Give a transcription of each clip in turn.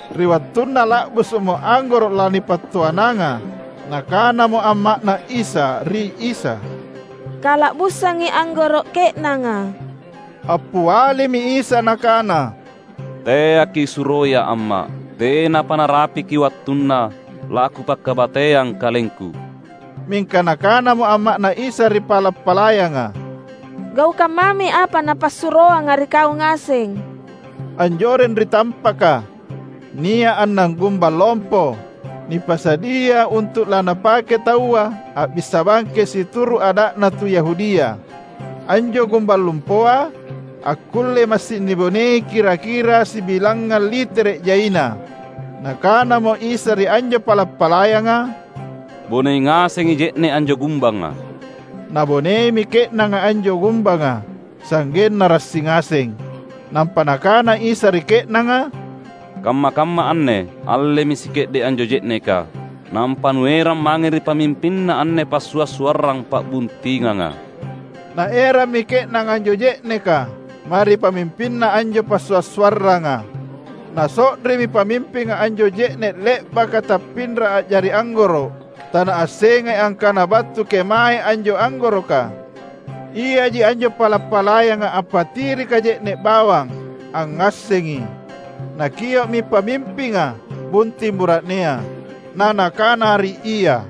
Ri wattunna la’busu’mo anggoro’ lanipattoananga, nakanamo amma’Na Isa ri Isa, "Kala’busangi anggoro’ ke’nanga." Appialimi Isa Nakana, "Teaki’ suroiA’ amma’. Tenapa narapiki wattunna laKupakabateang KalengKu." Mingka nakanamo amma’Na Isa ri pala’-palayanga, "Gaukang mami apa Napassuroanga ri kau ngaseng." Anjoreng ri tampaka, nia’ annang gumbang lompo, nipasadia untu’ lanapake taua a’bissa bangkeng situru’ ada’na tu Yahudia. Anjo gumbang lompoa akkullei massing nibonei kira-kira sibilangngang litere’ jaina. Nakanamo Isa ri anjo pala’-palayanga, "Bonei ngasengi je’ne’ anjo gumbanga." Naboneimi ke’nanga anjo gumbanga, sa’genna rassi ngaseng. Nampa Nakana Isa ri ke’nanga, "Kamma-kamma anne allemi sike’de’ anjo je’neka, nampa nuerang mange ri pamimpinna anne passua’-suarrang pa’buntinganga." Naerammi ke’nanga anjo je’neka mae ri pamimpinna anjo passua’-suarranga. Naso’rimi pamimpinga anjo je’ne’ le’baka tappinra a’jari anggoro’. (Tanaassengai angkana battu kemaei anjo anggoroka. Iaji anjo pala’-palayang appatirika je’ne’ bawang angngassengi.) Nakio’mi pamimpinga bunting bura’nea, na nakana ri ia,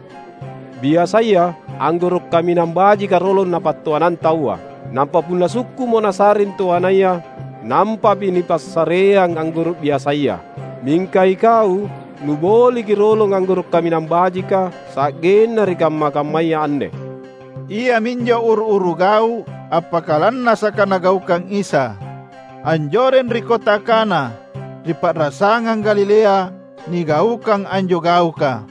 "Biasaya, anggoro’ kaminang bajika rolong napattoanang taua, nampa punna sukku’mo nasa’ring toanaya, nampami nipassareang anggoro’ biasaya. Mingka ikau nuboliki rolong anggoro’ kaminang bajika sa’genna ri kamma-kammaya anne!" Iaminjo uru-uru gau’ appakalannasaka Nagaukang Isa. Anjoreng ri kota Kana, ri pa’rasangang Galilea nigaukang anjo gauka.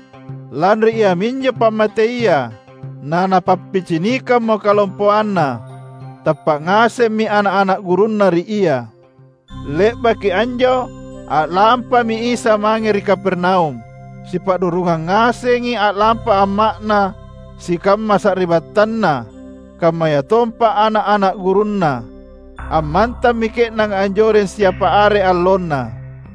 Lanri iaminjo pammateia naNapappicinikammo kalompoanNa. Tappa’ ngasemmi ana’-ana’ gurunNa ri Ia. Le’baki anjo, a’lampami Isa mange ri Kapernaum. Sipa’rurungang ngasengi a’lampa amma’Na, sikamma sari’battanNa, kammayatompa ana’-ana’ gurunNa. Ammantammi ke’nanga anjoreng siapa are allonna.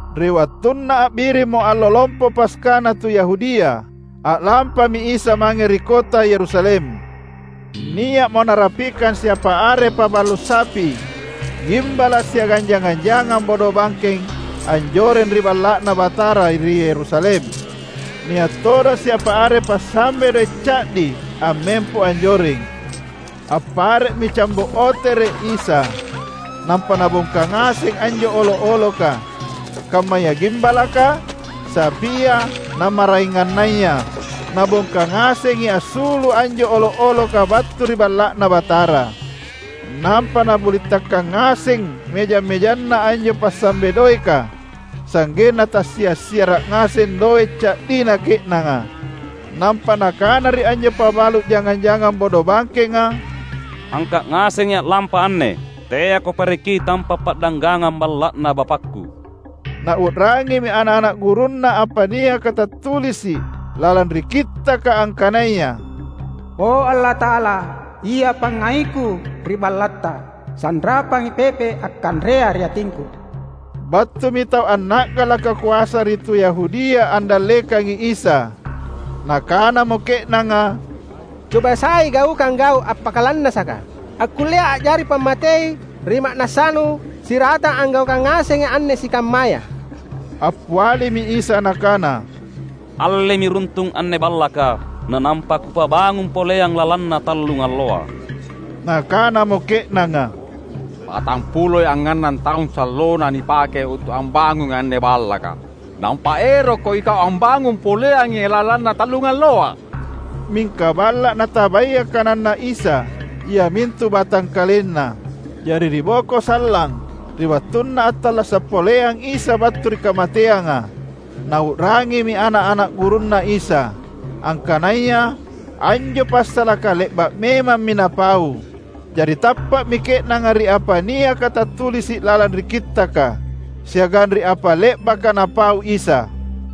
Ri wattunna a’birimmo Allo Lompo Paskana tu Yahudia, a’lampami Isa mange ri kota Yerusalem. Nia’mo Narapikang siapa are pabalu’ sapi, gimbala’ siagang jangang-jangang bodobangkeng anjoreng ri Balla’Na Batara ri Yerusalem; nia’ todong siapa are pasambe doe’ ca’di ammempo anjoreng. Appare’mi cambo’ otere’ Isa, nampa Nabongka ngaseng anjo olo’-oloka, kammaya gimbalaka, sapia, na maraengannaya. Nabongka ngasengi assulu’ anjo olo’-oloka battu ri Balla’Na Batara. Nampa Nabulintakkang ngaseng mejang-mejanna anjo pasambe doeka sa’genna tassia’-siara’ ngaseng doe’ ca’dina ke’nanga. Nampa Nakana ri anjo pabalu’ jangang-jangang bodobangkenga, "Angka’ ngasengi a’lampa anne. Teako pareki tampa’ pa’danggangang Balla’Na BapakKu!" Nau’rangimi ana’-ana’ gurunNa apa niaka tattulisi’ lalang ri Kittaka angkanaya, "O Allata’ala, ia pangngaiKu ri BallatTa, sanrapangi pepe’ akkanrea ri atingKu." Battumi tau anna’galaka koasa ri tu Yahudia andallekangi Isa. Nakanamo ke’nanga, "Coba sai gaukang gau’ appakalannasaka, akkullea a’jari pammatei ri ma’nassaNu siratang anggaukang ngasengi anne sikammaya." Appialimi Isa Nakana, "Allemi runtung anne Ballaka, na nampa Kupabangung poleang lalanna tallungalloa." Nakanamo ke’nanga, "Patampuloi angngannang taung sallona nipake untu’ ambangungi anne Ballaka. Nampa erokKo iKau ambangung poleangi lalanna tallungalloa?" Mingka Balla’ natabaya kananNa Isa, iamintu batangkalenNa. Jari ri boko sallang, ri wattunna attallasa’ poleang Isa battu ri kamateanga, nau’rangimi ana’-ana’ gurunNa Isa, angkanaya anjo passalaka le’ba’ memammi Napau. Jari tappa’mi ke’nanga ri apa niaka tattulisi’ lalang ri Kittaka, siagang ri apa le’baka Napau Isa.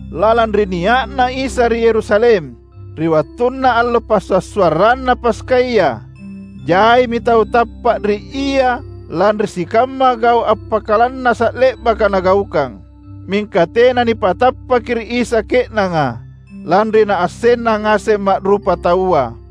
Lalang ri nia’na Isa ri Yerusalem, ri wattunna allo Passua’-suarranna Paskaya, jaimi tau tappa’ ri Ia lanri sikamma gau’ appakalannasa’ le’baka Nagaukang. Mingka tena nipatappaki ri Isa ke’nanga, lanri Naassenna ngaseng ma’rupataua.